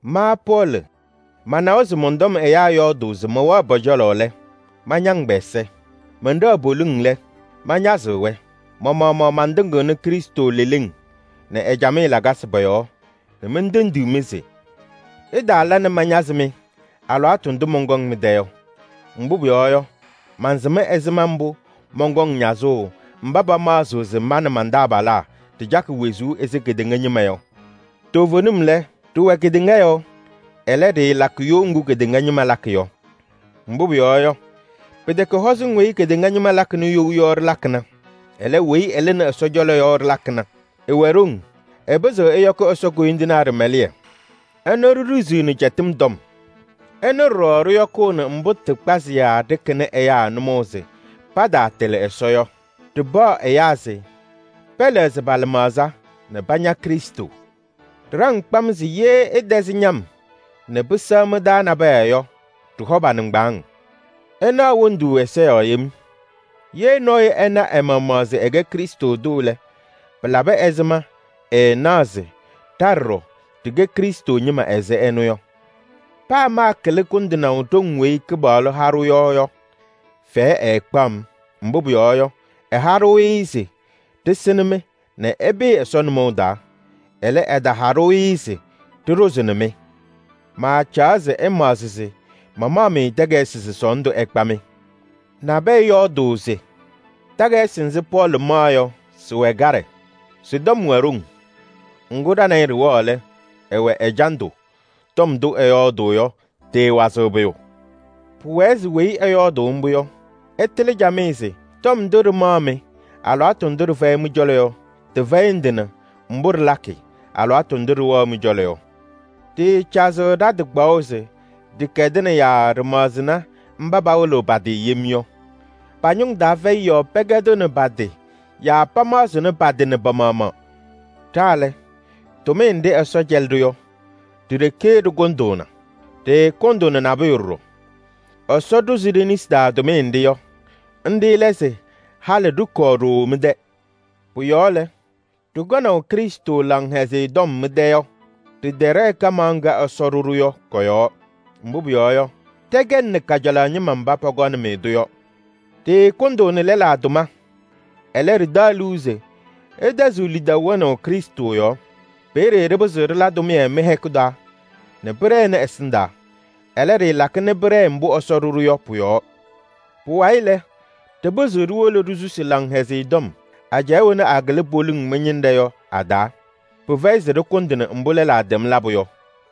Ma Pɔɔlɩ manawa se mɔn-tɔm ɛyaa yɔɔdʋʋ se mɛwɛɣ pɔ-cɔlɔ lɛ, mañaŋ pɛ-ɛza. Mɛnɖɛɣ poliŋ lɛ, mañazɩɣ-wɛ. Ma-maɣmaɣ mantɩŋɩɣnɩ Krɩstʋ leleŋ nɛ ɛ-camɩyɛ lakasɩ pɔ-yɔɔ nɛ mentendiɣ-mɩ se: ɩtaala nɛ mañazɩ-mɩ alɩwaatʋ ndʋ mɔnkɔŋ mɩ-tɛ yɔ. Mbʋ pʋyɔɔ yɔ, mansɩm ɛzɩma mbʋ mɔnkɔŋ ñazʋʋ mba pamaɣzɩɣ se ma nɛ man-taabalaa ɖɩcakɩ wezuu ɛzɩ kedeŋa ñɩma yɔ. Toovenim lɛ, ɖɩwɛ kedeŋa yɔɔ, ɛlɛ, ɖɩɩlakɩ you ŋgʋ kedeŋa ñɩma lakɩ yɔ. Mbʋ pʋyɔɔ yɔ, pɩtɛkɛ hɔzɩŋ weyi kedeŋa ñɩma lakɩnɩ you yɔ ɖɩlakɩna. Ɛlɛ, weyi ɩlɩnɩ Ɛsɔ cɔlɔ yɔ ɖɩlakɩna. Ɩwɛ ɖoŋ, ɩpɩzɩɣ ɛyɔkɩ Ɛsɔ koyindinaa ɖɩmɛlɩyɛ. Ɩnʋ ɖiɖiziɣni cɛtɩm tɔm. Ɩnʋ ɖɔɖɔ ɖɩyɔkʋʋnɩ mbʋ tɩ kpazɩyaa ɖɩkɩnɩ ɛyaa nʋmɔʋ se pataatɩlɩ Ɛsɔ yɔ. Ɖɩpaɣ ɛyaa se pɛlɛɣzɩ pa-lɩmaɣza nɛ paña Krɩstʋ. Ɖɩɖaŋ kpam se ye ɩtɛzɩ ñam nɛ pɩsɛɣ mɩ-taa nabɛyɛ yɔ, ɖɩhɔ pa-nɩŋgbaaŋ. Ɩnaɣ wondu ɛza yɔɔ yem. Ye nɔɔyʋ ɛna ɛ-maɣmaɣ se ɛkɛ Krɩstʋ tʋ lɛ, pɩlabɩ ɛzɩma ɛɛnaɣ se: ɖa ɖɔɖɔ ɖɩkɛ Krɩstʋ ñɩma ɛzɩ ɛnʋ yɔ? Paa maakɩlɩ kʋndɩnaʋ ɖoŋ weyi Kɩpaɣlʋ ha-ɖʋ yɔ yɔ, fɛyɛ ɛɛkpaɣ-m. Mbʋ pʋyɔɔ yɔ, ɛha-ɖʋ-ɩ se ɖɩsɩnɩ-mɩ nɛ ɩpɩɩ Ɛsɔ nʋmɔʋ taa. Ɛlɛ, ɛtaha-ɖʋ-ɩ se ɖɩɖʋzɩnɩ-mɩ. Maacaɣ se ɩmaɣzɩ se mamaɣ-mɩ takayɩsɩ se sɔɔndʋ ɛkpa-mɩ. Nabɛyɛ yɔɔdʋʋ se: “Takayɩsɩ nzɩ Pɔɔlɩ maɣ yɔ sɩwɛ kaɖɛ, sɩ-tɔm wɛ ɖoŋ. Ŋgʋ ɖa nɛ ɩ ɖɩwɛɣ lɛ, ɛwɛ ɛjandʋ, tɔm ndʋ ɛyɔɔdʋʋ yɔ tɩɩwazɩɣ pʋyʋ.” Pʋwɛɛ se weyi ɛyɔɔdʋʋ mbʋ yɔ, ɛtɩlɩ camɩyɛ se: tɔm ndʋ ɖɩmaɣ-mɩ alɩwaatʋ ndʋ ɖɩfɛyɩ mɩ-cɔlɔ yɔ, tɩfɛyɩ ndɩ nɛ mbʋ ɖɩlakɩ alɩwaatʋ ndʋ ɖɩwɛɣ mɩ-cɔlɔ yɔ. Ɖɩɩcazɩɣ ɖa-tɩ kpaɣʋ se ɖɩkɛdɩna yaa ɖɩmaɣzɩnɩ mba pawɩlɩɣ pa-tɩ yem yɔ. Pa-ñʋŋ taa fɛyɩ yɔɔ pɛkɛdɩɣnɩ pa-tɩ yaa pamaɣzɩɣnɩ pa-tɩ nɛ pa-maɣmaɣ. Ɖa lɛ, tʋmɩyɛ nɖɩ Ɛsɔ cɛlɩ-ɖʋ yɔ, ɖi-ɖeke ɖɩkʋndʋʋna. Ɖɩɩkʋndʋʋnɩ nabʋyʋ ɖɔɖɔ. Ɛsɔ ɖʋzɩ ɖe-nesi taa tʋmɩyɛ nɖɩ yɔ, nɖɩ lɛ se halɩ ɖɩkɔɔ ɖooo mɩ-tɛ. Pʋ-yɔɔ lɛ, ɖɩkɔnaʋ Krɩstʋ Laŋhɛzɩyɛ Tɔm mɩ-tɛ yɔ, ɖɩtɛɖɛɛ kamaɣ ŋga Ɛsɔ ɖʋ-ɖʋ yɔ kɔ-yɔɔ. Mbʋ pʋyɔɔ yɔ, ɖɛkɛnɩ kajalaɣ ñɩma mba pɔkɔnɩ-mɩ-tʋ yɔ. Ɖɩɩkʋndʋʋnɩ lɛlaa tʋma. Ɛlɛ, ɖɩtaɣ liu se ɩtɛzɩɣ lidaʋ wɛnaʋ Krɩstʋ yɔɔ. Peeye ɖɩpɩzɩɣ ɖɩla tʋmɩyɛ mɩ-hɛkʋ taa nɛ pɩɖɛnɩ ɛsɩndaa. Ɛlɛ, ɖɩɩlakɩ nɛ pɩɖɛɛ mbʋ Ɛsɔ ɖʋ-ɖʋ yɔ pʋ-yɔɔ. Pʋwayɩ lɛ, ɖɩpɩzɩɣ ɖiwolo ɖisusi Laŋhɛzɩyɛ Tɔm ajɛɛ wɛna akɩlɩ poliŋ mɩ-ñɩnɖɛ yɔ a-taa. Pɩfɛyɩ se ɖɩkʋndɩnɩ mbʋ lɛlaa tɛm labʋ yɔ.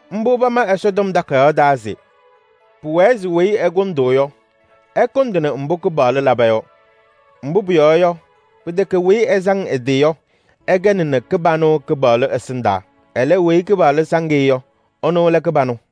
Mbʋ pama Ɛsɔtɔm Takayaɣ taa se: “Pʋwɛɛ se weyi ɛkʋndʋʋ yɔ, ɛkʋndɩnɩ mbʋ Kɩpaɣlʋ laba yɔ.” Mbʋ pʋyɔɔ yɔ, pɩtɛkɛ weyi ɛsaŋ ɛ-tɩ yɔ, ɛkɛnɩ kɩbanʋ Kɩpaɣlʋ ɛsɩndaa. Ɛlɛ, weyi Kɩpaɣlʋ saŋ-ɩ yɔ, ɛnʋ lɛ kɩbanʋ.